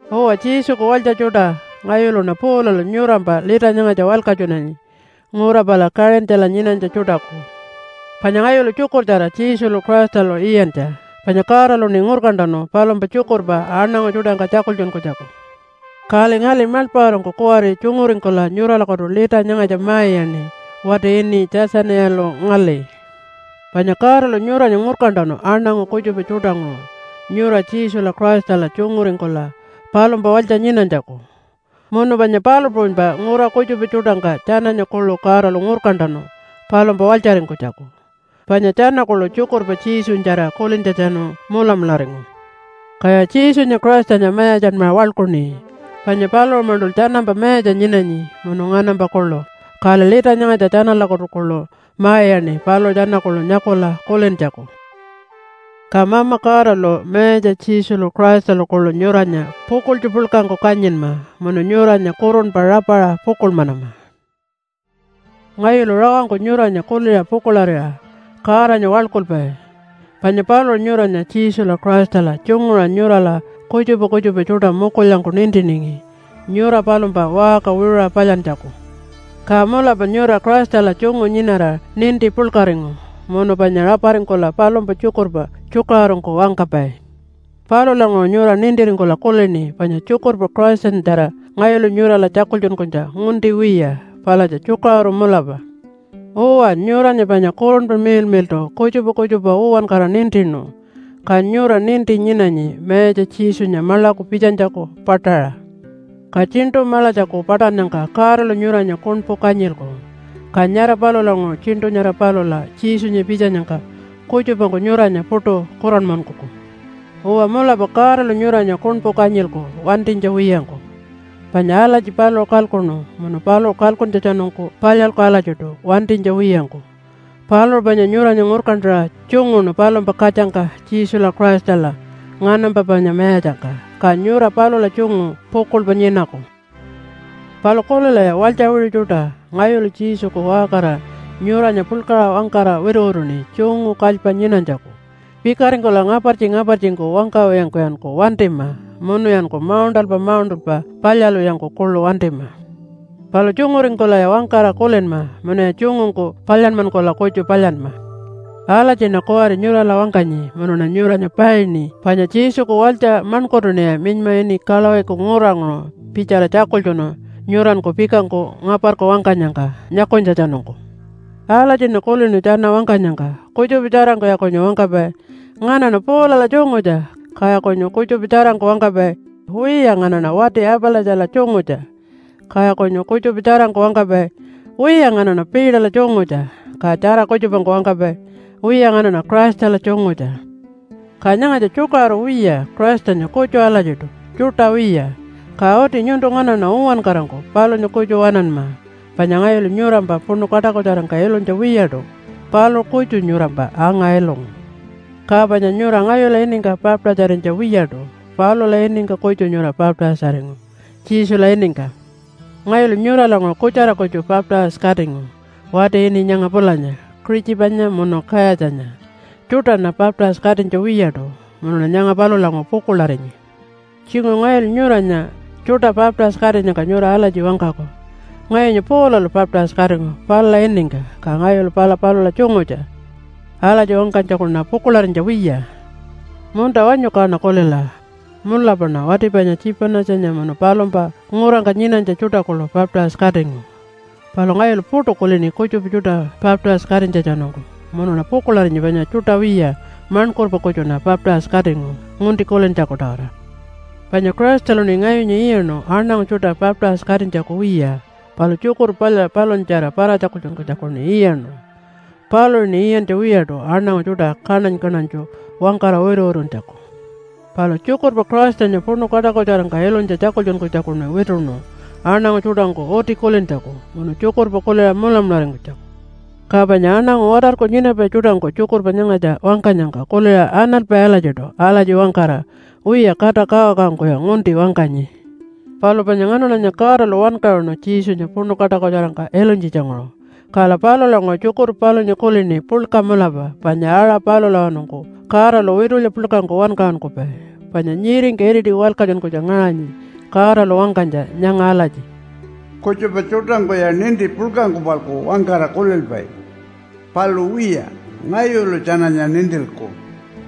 Uwa, Jesuku walytja tjuṯa, ngayuluṉa Paulalu nyurampa lita nyangatja walkatjunanyi ngura pala Kaṟintjala nyinanytja tjuṯaku. Panya ngayulu tjukurtjara Jesulu Christalu iyantja, panya Godaluṉi ngurkantanu palumpa tjukurpa aṉangu tjuṯangka tjakultjunkunytjaku. Kali ngali maḻpaṟarangku kuwari tjunguringkula nyuralakutu lita nyangatja ma-iyaṉi wati ini Tjatjaniyalu ngali. Panya Godalu nyuranya ngurkantanu aṉangu kutjupa tjuṯanguṟu nyura Jesula Christala tjunguringkula palumpa walytja nyinanytjaku. Munu panya palu puṟunypa ngura kutjupa tjuṯangka tjananya kuḻu Godalu ngurkantanu palumpa walytjaringkunytjaku, panya tjana kuḻu tjukurpa Jesunyatjara kulintjatjanu mulamularingu. Kaya Jesunya Christanya mayatjanmaṟa waḻkuṉi, panya paluṟu-maṉṯul tjanampa mayatja nyinanyi munu nganampa kuḻu. Kali lita nyangatja tjanalakutu kuḻu ma-iyaṉi paluṟu tjana kuḻu nyakula kulintjaku. Ka Mama Godalu, Mayatja Jesulu Christalu kuḻu nyuranya pukuḻtju puḻkangku kanyinma munu nyuranya kurunpa rapaṟa pukuḻmanama. Ngayulu rawangku nyuranya kuliṟa pukuḻarira Godanya waḻkulpai, panya paluṟu nyuranya Jesula Christala tjunguṟa nyurala kutjupa kutjupa tjuṯa mukulyangku nintiningi nyura palumpa waṟka wiṟuṟa palyantjaku. Ka mulapa nyura Christala tjungu nyinara ninti puḻkaringu munu panya raparingkula palumpa tjukurpa tjukaṟurungku wangkapai. Palulanguṟu nyura nintiringkula kulini panya tjukurpa Christanyatjara ngayulu nyurala tjakultjunkunytja ngunti wiya, palatja tjukaṟuru mulapa. Uwa, nyuranya panya Kurunpa Miḻmiḻṯu kutjupa kutjupa uwankara nintinu, ka nyura ninti nyinanyi Mayatja Jesunya maḻaku pitjanytjaku paṯaṟa. Ka Tjiṉṯu Maḻatjaku paṯannyangka Godalu nyuranya kuṉpu kanyilku. Ka nyara palulanguṟu tjiṉṯu nyara palula Jesunya pitjanyangka, kutjupangku nyuranya puṯu kuranmankuku. Uwa mulapa Godalu nyuranya kuṉpu kanyilku wantinytja wiyangku, panya alatji paluṟu kalkuṉu munu paluṟu kalkuntjatjanungku palyalku alatjiṯu wantinytja wiyangku. Paluṟu panya nyuranya ngurkantaṟa tjunguṉu palumpa katjangka Jesula Christala nganampa panya mayatjangka, ka nyura palula tjungu pukuḻpa nyinaku. Palu kulilaya walytja wiṟu tjuṯa. Ngayulu Jesuku waṟkarira nyuranya puḻkaṟa wangkara wituwituṉi tjungu kalypa nyinanytjaku. Pikaringkula ngapartji-ngapartjingku wangkawiyangkuyanku wantima, munuyanku mauṉṯalpa mauṉṯalpa palyalwiyangku kuḻu wantima. Palu tjunguringkulaya wangkara kulinma munuya tjungungku palyanmankula kutju palyanma. Alatjiṉa kuwari nyurala wangkanyi munuṉa nyuranya paini panya Jesuku walytja maṉkurtuṉiya minyma ini Kalawiku nguranguṟu pitjala tjakultjunu nyuranku pikangku ngaparku wangkanyangka nyakunytjatjanungku. Alatjiṉa kulinu tjana wangkanyangka, kutjupa tjarangkuya kunyu wangkapai, “Nganaṉa Paulala tjungutja.” Kaya kunyu kutjupa tjarangku wangkapai, “Wiya, nganaṉa wati Apalatjala tjungutja.” Kaya kunyu kutjupa tjarangku wangkapai, “Wiya, nganaṉa Peterla tjungutja.” Ka tjara kutjupangku wangkapai, “Wiya, nganaṉa Christala tjungutja.” Ka nyangatja tjukaṟuru wiya. Christanya kutju alatjiṯu, tjuṯa wiya, ka uti nyuntu nganaṉa uwankarangku palunya kutju waṉanma. Panya ngayulu nyurampa puṉu kaṯakutjarangka ilunytja wiyaṯu, paluṟu kutju nyurampa anga-ilungu. Ka panya nyura ngayula iningka baptise-arinytja wiyaṯu, palula iningka kutju nyura baptise-aringu, Jesula iningka. Ngayulu nyuralanguṟu kutjara kutju baptise-katingu wati ini nyanga pulanya Kuṟitjipanya munu Kayatjanya. Tjuṯaṉa baptise-katinytja wiyaṯu munuṉa nyanga palulanguṟu pukuḻarinyi. Tjinguṟu ngayulu nyuranya tjuṯa baptise-katinyangka nyura alatji wangkaku, “Ngayunya Paulalu baptise-katingu palula iningka, ka ngayulu pala palula tjungutja.” Alatji wangkanytjakuṉa pukuḻarinytja wiya. (Munta wanyu kaṉa kulila, mulapaṉa wati panya Tjipanatjanya, munu palumpa ngurangka nyinanytja tjuṯa kuḻu baptise-katingu. Palu ngayulu puṯu kulini kutjupa tjuṯa baptise-katinytjatjanungku. Munuṉa pukuḻarinyi panya tjuṯa wiya, maṉkurpa kutjuṉa baptise-katingu, ngunti kulintjaku-tawara.) Panya Christaluṉi ngayunya iyaṉu aṉangu tjuṯa baptise-katinytjaku wiya, palu tjukurpa palya palunyatjara para-tjakultjunkunytjakuṉi iyaṉu. Paluṟuṉi iyantja wiyaṯu aṉangu tjuṯa kaṉany-kaṉanytju wangkara wituwituntjaku. Palu tjukurpa Christanya puṉu kaṯakutjarangka ilunytja tjakultjunkunytjakuṉi wituṉu aṉangu tjuṯangku uti kulintjaku munu tjukurpa kuliṟa mulamularingkunytjaku. Ka panya aṉangu watarku nyinapai tjuṯangku tjukurpa nyangatja wangkanyangka kuliṟa analpai alatjiṯu alatji wangkara, “Wiya, kata kawakawangkuya ngunti wangkanyi.” Palu panya nganaṉanya Godalu wankaṟunu Jesunya puṉu kaṯakutjarangka ilunytjitjanguṟu. Kala palulanguṟu tjukurpa palunya kulini puḻka mulapa panya aṟa palulawanungku Godalu witulya puḻkangku wankaṟunkupai. Panya nyiringka iriti walkatjunkunytja ngaṟanyi Godalu wangkanytja nyanga alatji, “Kutjupa tjuṯangkuya ninti puḻkangku-palku wangkara kulilpai. Palu wiya, ngayulu tjananya nintilku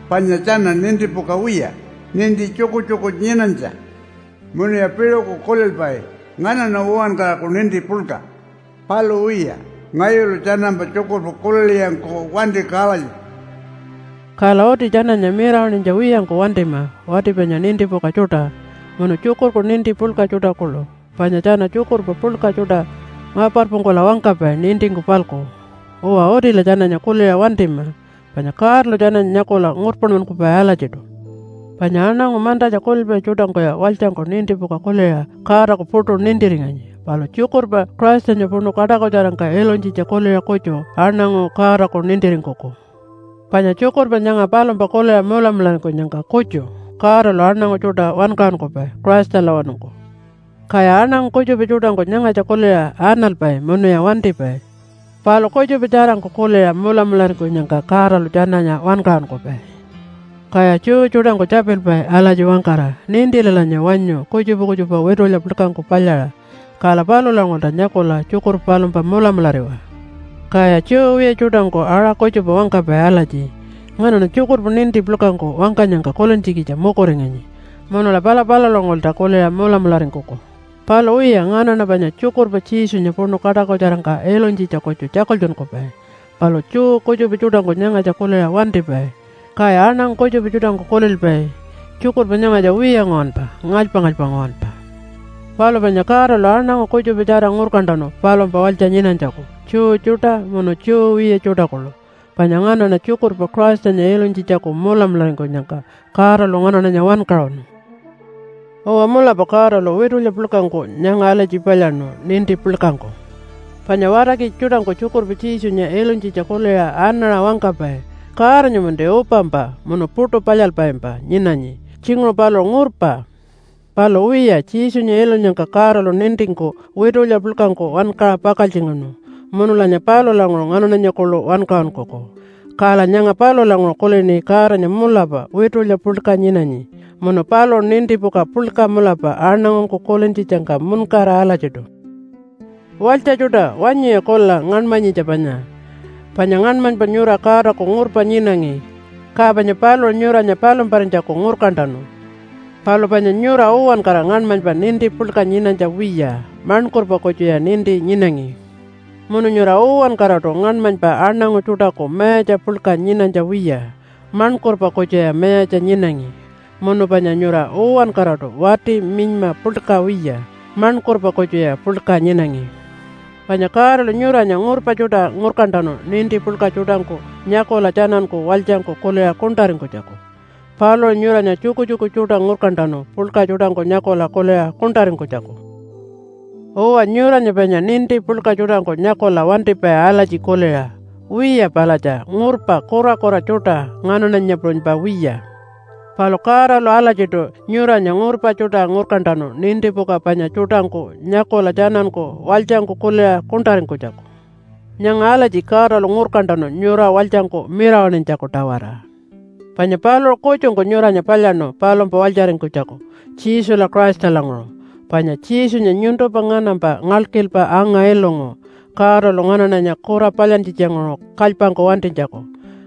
panya tjana nintipuka wiya, ninti tjukutjuku nyinanytja. Munuya piṟuku kulilpai, ‘Nganaṉa uwankaraku ninti puḻka.’ Palu wiya, ngayulu tjanampa tjukurpa kulilwiyangku wantiku alatjiṯu.” Kala uti tjananya mirawaṉinytja wiyangku wantima wati panya nintipuka tjuṯa, munu tjukurku ninti puḻka tjuṯa kuḻu, panya tjana tjukurpa puḻka tjuṯa ngaparpungkula wangkapai nintingku-palku. Uwa, utila tjananya kuliṟa wantima, panya Godalu tjananya nyakula ngurpanmankupai alatjiṯu. Panya aṉangu mantatja kulilpai tjuṯangkuya walytjangku nintipuka kuliṟa Godaku puṯu nintiringanyi. Palu tjukurpa Christanya puṉu kaṯakutjarangka ilunytjitja kuliṟa kutju aṉangu Godaku nintiringkuku. Panya tjukurpa nyanga palumpa kuliṟa mulamularingkunyangka kutju Godalu aṉangu tjuṯa wankaṟunkupai Christalawanungku. Kaya aṉangu kutjupa tjuṯangku nyangatja kuliṟa analpai munuya wantipai, palu kutjupa tjarangku kuliṟa mulamularingkunyangka Godalu tjananya wankaṟunkupai. Kaya Jew tjuṯangku tjapilpai alatji wangkara, “Nintilalanya wanyu kutjupa kutjupa witulya puḻkangku palyaṟa, kala palulanguṟulta nyakula tjukurpa palumpa mulamulariwa.” Kaya Jew wiya tjuṯangku aṟa kutjupa wangkapai alatji, “Nganaṉa tjukurpa ninti puḻkangku wangkanyangka kulintjikitja mukuringanyi, munula pala palulanguṟulta kuliṟa mulamularingkuku.” Palu wiya, nganaṉa panya tjukurpa Jesunya puṉu kaṯakutjarangka ilunytjitja kutju tjakultjunkupai. Palu Jew kutjupa tjuṯangku nyangatja kuliṟa wantipai. Kaya aṉangu kutjupa tjuṯangku kulilpai, “Tjurkurpa nyangatja wiya nguwanpa, ngalypa-ngalypa nguwanpa.” Palu panya Godalu aṉangu kutjupatjara ngurkantanu palumpa walytja nyinanytjaku Jew tjuṯa munu Jew wiya tjuṯa kuḻu. Panya nganaṉa tjukurpa Christanya ilunytjitjaku mulamularingkunyangka Godalu nganaṉanya wankaṟunu. Uwa, mulapa Godalu witulya puḻkangku nyanga alatji palyaṉu ninti puḻkangku. Panya watarkitja tjuṯangku tjukurpa Jesunya ilunytjitja kuliṟa anaṟa wangkapai, “Godanya-manti upampa munu puṯu palyalpaimpa nyinanyi. Tjinguṟu paluṟu ngurpa.” Palu wiya, Jesunya ilunyangka Godalu nintingku witulya puḻkangku wankaṟa pakaltjingaṉu, munulanya palulanguṟu nganaṉanya kuḻu wankaṟunkuku. Kala nyanga palulanguṟu kulini Godanya mulapa witulya puḻka nyinanyi, munu paluṟu nintipuka puḻka mulapa aṉangungku kulintjitjangka muṉkara alatjiṯu. Walytja tjuṯa, wanyuya kulila ngaṉmanyitja panya, panya ngaṉmanypa nyura Godaku ngurpa nyinangi, ka panya paluṟu nyuranya palumparinytjaku ngurkantanu. Palu panya nyura uwankara ngaṉmanypa ninti puḻka nyinanytja wiya, maṉkurpa kutjuya ninti nyinangi. Munu nyura uwankaraṯu ngaṉmanypa aṉangu tjuṯaku mayatja puḻka nyinanytja wiya, maṉkurpa kutjuya mayatja nyinangi. Munu panya nyura uwankaraṯu wati minyma puḻka wiya, maṉkurpa kutjuya puḻka nyinangi. Panya Godalu nyuranya ngurpa tjuṯa ngurkantanu ninti puḻka tjuṯangku nyakula tjananku walytjangku kuliṟa kuṉṯaringkunytjaku. Paluṟu nyuranya tjukutjuku tjuṯa ngurkantanu puḻka tjuṯangku nyakula kuliṟa kuṉṯaringkunytjaku. Uwa, nyuranya panya ninti puḻka tjuṯangku nyakula wantipai alatji kuliṟa, “Wiya palatja ngurpa kurakura tjuṯa, nganaṉanya puṟunypa wiya.” Palu Godalu alatjiṯu nyuranya ngurpa tjuṯa ngurkantanu nintipuka panya tjuṯangku nyakula tjananku walytjangku kuliṟa kuṉṯaringkunytjaku. Nyanga alatji Godalu ngurkantanu nyura walytjangku mirawaṉinytjaku-tawara. Panya paluṟu kutjungku nyuranya palyaṉu palumpa walytjaringkunytjaku Jesula Christalanguṟu. Panya Jesunya nyuntumpa nganampa ngalkilpa anga-ilungu Godalu nganaṉanya kura palyantjitjanguṟu kalypangku wantinytjaku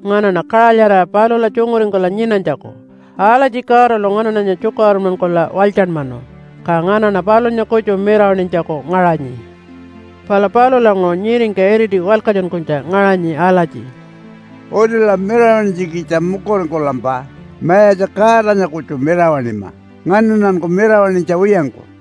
nganaṉa kaṟalyarira palula tjunguringkula nyinanytjaku. Alatji Godalu nganaṉanya tjukaṟurunmankula walytjanmanu, ka nganaṉa palunya kutju mirawaṉinytjaku ngaṟanyi. Pala palulanguṟu nyiringka iriti walkatjunkunytja ngaṟanyi alatji, “Utila mirawaṉinytjikitja mukuringkulampa Mayatja Godanya kutju mirawaṉima nganaṉanku mirawaṉinytja wiyangku.”